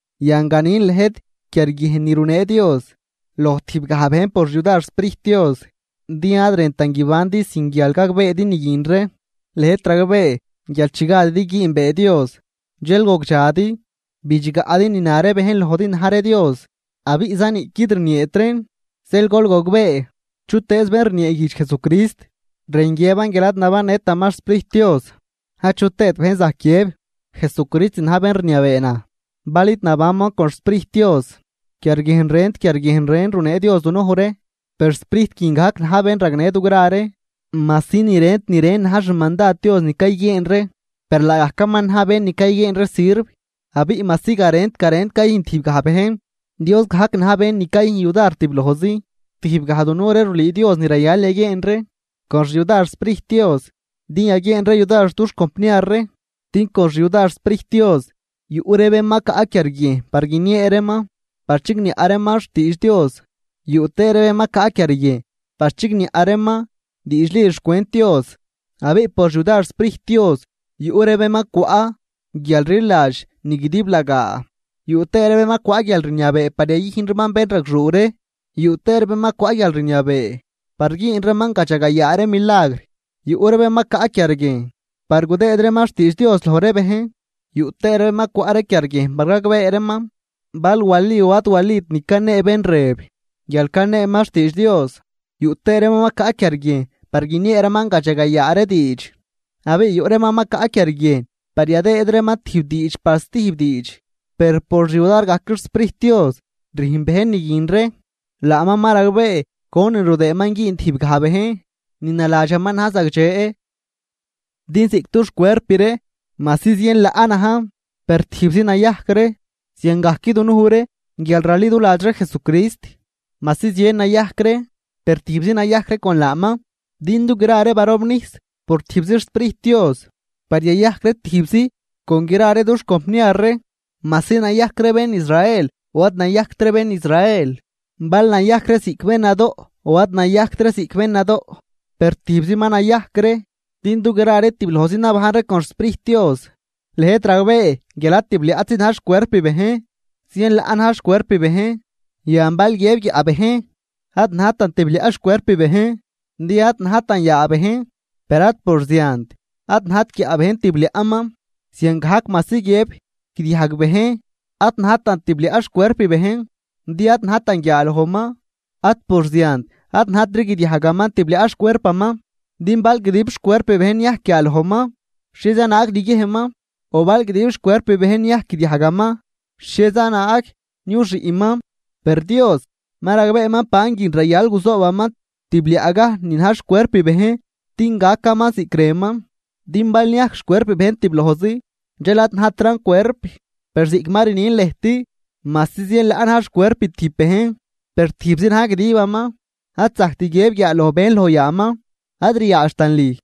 Yan ganin lëjt, quiarguiejn ni runee Dios loj tijb gaj bejn por xyudar xSprijt Dios, din ad rëntan guibandi sin guial gagbeedi ni guin ree. Lëjt ragbee guial chi gadidi güünbee Dios dxel gogdxadi, bidxgaꞌdi ni na ree bejn lojdi na̱j ree dios abiꞌza niꞌquid rnieet reen. Zeel gol gogbee, chutëëz bén rnieeguijdx Jesucrist, rën guiëban guial ad nabannëtaman xSprijt Dios. Achu tëët bejn zajc guiëb: “¡Jesucrist na̱j bén rniabee naj!”, bal id nabanman con xSprijt Dios. Quiarguiejn rent quiarguiejn ren runee Dios dunuj ree, per Sprijt guin gajc na̱j bén ragnë dugra ree. Majsi ni rent ni ren na̱j xmandad Dios ni cayguieen ree, per laagajcaman na̱j bén ni cayguieen ree sirv. Abiꞌ majsi garent garen cayüjn tijbgaj bejn, Dios gajc na̱j bén ni cayüjn yudar tiblojzi. Tijbgaj dunuj ree rulüü Dios ni rayal yaguieen ree con xyudar xSprijt Dios din yaguieen ree yudar dux compniar ree. Din con xyudar xSprijt Dios yuꞌ ree bén ma caꞌ quiarguiejn par guiniee reeman, yuꞌ tëë ree bén ma caꞌ quiarguiejn par chigniaꞌ reeman diidxli xcwent Dios. Abiꞌ por xyudar xSprijt Dios yuꞌ ree bén ma cwaꞌ guialrliladx ni guidiblagaa. Yuꞌ tëë ree bén ma cwaꞌ guialrniabee par yayüjn reeman bénragxuu ree. Yuꞌ tëë ree bén ma cwaꞌ guialrniabee par güün reeman gadxagayaa ree milagr. Yuꞌ ree bén ma caꞌ quiarguiejn par gudëëd reeman xtiidx Dios loj ree bejn. Yuꞌ tëë ree bén ma cwaꞌ ree quiarguiejn par gagbee reeman bal wali o ad walit ni canee bén rëb guial caneeman xtiidx Dios. Yuꞌ tëë reeman ma caꞌ quiarguiejn par guiniee reeman gadxagayaa ree diidx, abiꞌ yuꞌ reeman ma caꞌ quiarguiejn par yadëëd reeman tijb diidx par stijb diidx. Per por xyudar gajc xSprijt Dios rüjn bejn ni guin ree, laaman ma ragbee conin rudëëman güün tijb gaj bejn ni naladxaman na̱j zagdxe. Din ziꞌc dux cuerp ree majsi zien laꞌ najn, per tijbzi nayajc ree. Ziangajc dunuj ree guial raliduladx ree Jesucrist majsi zien nayajc ree per tijbzi nayajc ree con laaman. Din dugra ree barobnijs por tijbzi xSprijt Dios par yayajc ree tijbzi con gra ree dux compniar ree majsi nayajc ree bén Israel o ad nayajct ree bén Israel, bal nayajc ree ziꞌc bén nadoꞌ o ad nayajct ree ziꞌc bén nadoꞌ, per tijbzi ma nayajc ree din dugra ree tiblojzi nabajn ree con xSprijt Dios. Lëjt ragbee guial ad tibliaꞌtzi na̱j xcuerp bejn, zien laꞌ na̱j xcuerp bejn. Yan bal guiëb guiaꞌ bejn: “Ad najtan tibliaꞌ xcuerp bejn din ad najtan yaa bejn.” Per ad por ziant ad najt guiaꞌ bejn tibliaꞌman. Ziangajc majsi guiëb guidiajg bejn: “Ad najtan tibliaꞌ xcuerp bejn din ad najtan guiaalojman”, ad por ziant ad najtri guidiajgaman tibliaꞌ xcuerpaman. Din bal guidib xcuerp bejn niajc guiaalojman, ¿xhieza naag niguiejnman?, o bal guidib xcuerp bejn niajc guidiajgaman, ¿xhieza naag niuxiꞌman? Per Dios ma ragbeeman banguin rayal guzoobaman tibliaꞌgaj ni na̱j xcuerp bejn din gacaman ziꞌc rënman. Din bal niajc xcuerp bejn tiblojzi, dxel ad najtran cuerp. Per ziꞌc ma rnin lëjt majsi zien laꞌ na̱j xcuerp tijb bejn per tijbzi na̱j guidiban. Ad zajct guiëb guiaaloj bejn loj yaaman: “Ad ryaadxtan lüj.”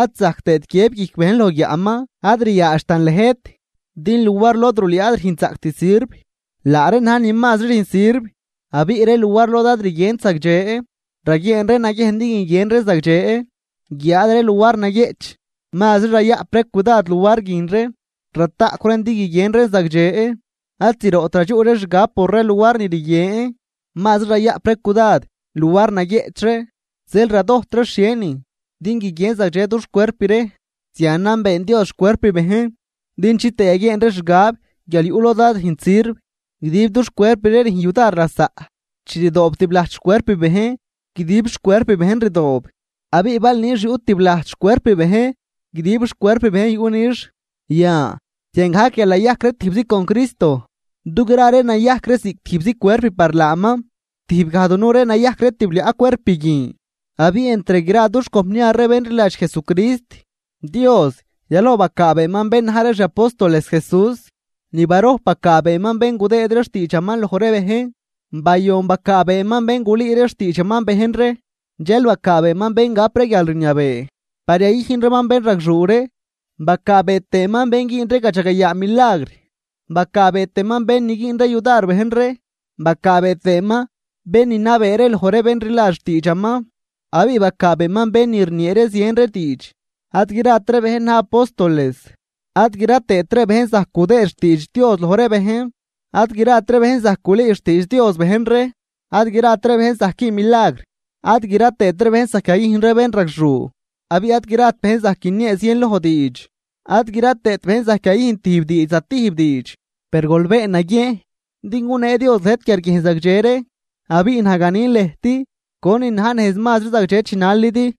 Ad zajct tëët guiëb guijc bejn loj guiaꞌman: “Ad ryaadxtan lëjt.” Din luar lod rulüü ad rüjnzaꞌct sirv, laa reen na̱j ni mazri rüjn sirv. Abiꞌ ree luar lod ad rguient zagdxe, raguieen ree naguiejn din guiguien reen zagdxe. Guiáad ree luar naguieꞌch, mazri rayaꞌp ree cudad luar guin ree rataꞌcw reen din guiguien reen zagdxe. Ad zroꞌt radxuꞌ ree xgab por ree luar ni rguien, mazri rayaꞌp ree cudad luar naguieꞌch ree zeel radojt ree xhienin din guiguien zagdxe dux cuerp ree. Zianan been Dios xcuerp bejn din chitëë yaguieen ree xgab guial yuꞌ lod ad rüjnt sirv, guidib dux cuerp ree rüjn yudar lasaꞌ. Chi rdoob tiblajt xcuerp bejn guidib xcuerp bejn rdoob, abiꞌ bal nix yuꞌ tiblajt xcuerp bejn guidib xcuerp bejn yuꞌ nix. Yan ziangajc guial nayajc ree tijbzi con Cristo dugra ree nayajc ree ziꞌc tijbzi cuerp par laaman, tijb gaj dunuj ree nayajc ree tibliaꞌ cuerp guin. Abiꞌ entr gra dux compniar ree bén rliladx Jesucrist. Dios yaloj bacaabeeman bén na̱j ree xi apóstoles Jesús, ni barojp bacaabeeman bén gudëëd ree xtiidxaman loj ree bejn, bayon bacaabeeman bén gulüü ree xtiidxaman bejn ree, dxel bacaabeeman bén gap ree guialrniabee par yayüjn reeman bénragxuu ree. Bacaabee tëëman bén güün ree gadxagayaa milagr. Bacaabee tëëman bén ni güün ree yudar bejn ree. Bacaabee tëëman bén ni nabee ree loj ree bén rliladx xtiidxaman abiꞌ bacaabeeman bén ni rniee ree zien ree diidx. Ad grat ree bejn na̱j apóstoles ad gra tëët ree bejn zajc gudëëd xtiidx Dios loj ree bejn, ad grat ree bejn zajc gulüü xtiidx Dios bejn ree. Ad grat ree bejn zajc güün milagr, ad gra tëët ree bejn zajc yayüjn ree bénragxuu, abiꞌ ad grat bejn zajc guiniee zienloj diidx ad gra tëët bejn zajc yayüjn tijb diidx zatijb diidx. Per gol been naguiejn din gunee Dios lëjt quiarguiejn zagdxe ree, abiꞌ naj ganin lëjt conin na̱j nejz mazri zagdxe chinalidi.